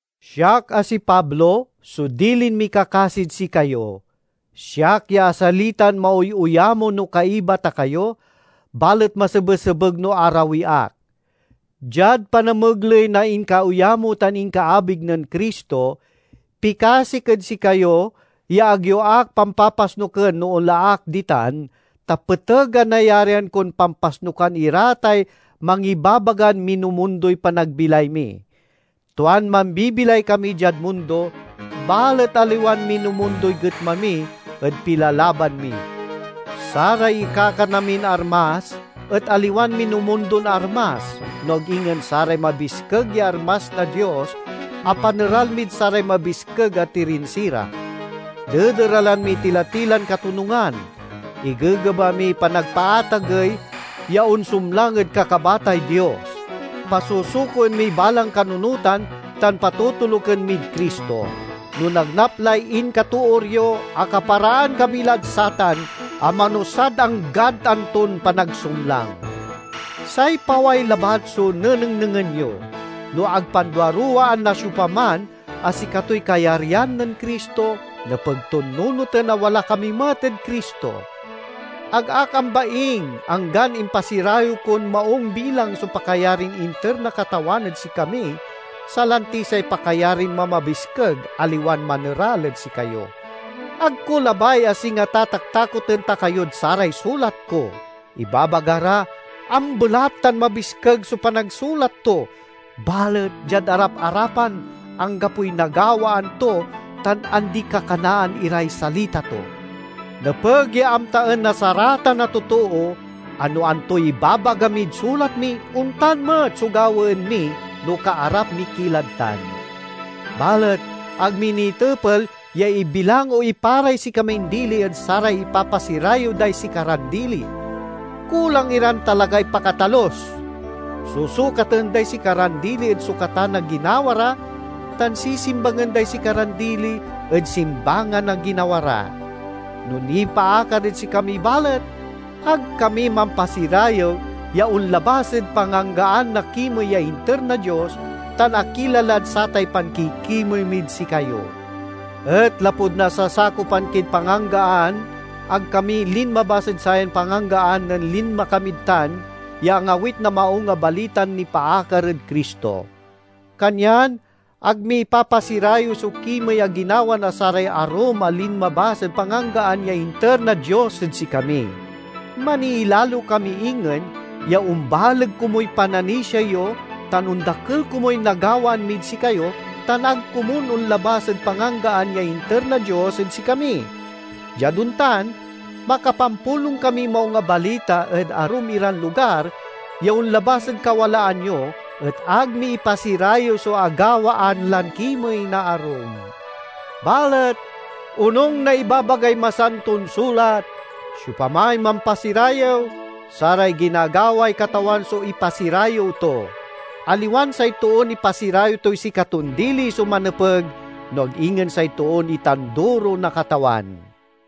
Siak, a si Pablo, so dilin mikakasid sikayo—siak ya asalitan maoyo-yamo no kaiba ta kayo, balet masebesebeg no arawi ak. Diad panamegley na inkaoyamo tan inkaabig nen Cristo, pikasik ed sikayo ya ag yo ak pampapasnuken no onla ak ditan, ta peteg a nayarian kon pampasnukan ira tay mangibabagan minumundoy panagbilay mi. Tuan mambibilay kami diad mundo, balet aliwan minumundoy getma mi ed pilalaban mi. Saray ikakana min armas et aliwan minumundon armas, no ag ingen saray mabiskeg ya armas na Dios a paneral mid saray mabiskeg a tirinsira. Dederalen miy tila-tilan katonungan; igegeba miy panagpaatagey ya onsumlang ed kakabatay Dios. Pasusukoen miy balang kanunotan tan patotoluken mid Cristo. No nagnap lay inkatoor yo, akaparaan kami lad satan a manusad anggad anton panagsumlang. Say paway labat so nenengnengen yo. No ag panduaruwaan na siopaman a sikatoy kayaryan nen Cristo, nepeg ton nunoten a wala kami met ed Cristo. Ag ak ambaing, anggan impasirayew kon maung bilang so pakayarin inter na Katawan ed sikami, salanti say pakayarin mamabiskeg, aliwan maneral ed sikayo. Ag ko labay a singa tataktakoten ta kayod saray sulat ko. Ibabaga ra, "Ambelat tan mabiskeg so panagsulat to, balet diad arap-arapan anggapoy nagawaan to tan andi-kakanaan iray salita to!" Nepeg ya amtaen na saratan a totoo a no antoy ibabaga mid sulat mi, ontan met so gawaen mi no kaarap mi ki lad tan. Balet ag mi nitepel ya ibilang o iparay sikamin dili ed saray ipapasirayew day sikaran dili. Kulang iran talagay pakatalus! Susukaten day sikaran dili ed sukatan a ginawa ra, tan sisimbangen day sikaran dili ed simbangan a ginawa ra! No nipaakar ed sikami balet, ag kami mampasirayew ya onlabas ed panganggaan na kimey ya inter na Dios, tan akila lad satay pankikimey mid sikayo. Et lapud nasasakopan kid panganggaan, ag kami linmabas ed sayan panganggaan nen linma kamid tan ya angawit na Maung a Balitan nipaakar ed Cristo. Kanyan ag mi ipapasirayew so kimey a ginawa na saray arum a linmabas ed panganggaan ya initer na Dios ed sikami. Maniilalo kami ingen ya ombaleg komuy pananisia yo tan ondakel komuy nagawaan mid sikayo, tan ag komun onlabas ed panganggaan ya inter na Dios ed sikami. Diad ontan, makapampulong kamiy Maung a Balita ed arum iran lugar ya onlabas ed kawalaan yo, et ag mi ipasirayew so agawaan lan kimey na arum. Balet onung na ibabagay Masanton Sulat, "Siopamay mampasirayew, saray ginagaway Katawan so ipasirayew to." Aliwan say toon ipasirayew toy sikaton dili so manepeg, no ag ingen say toon itanduro na Katawan.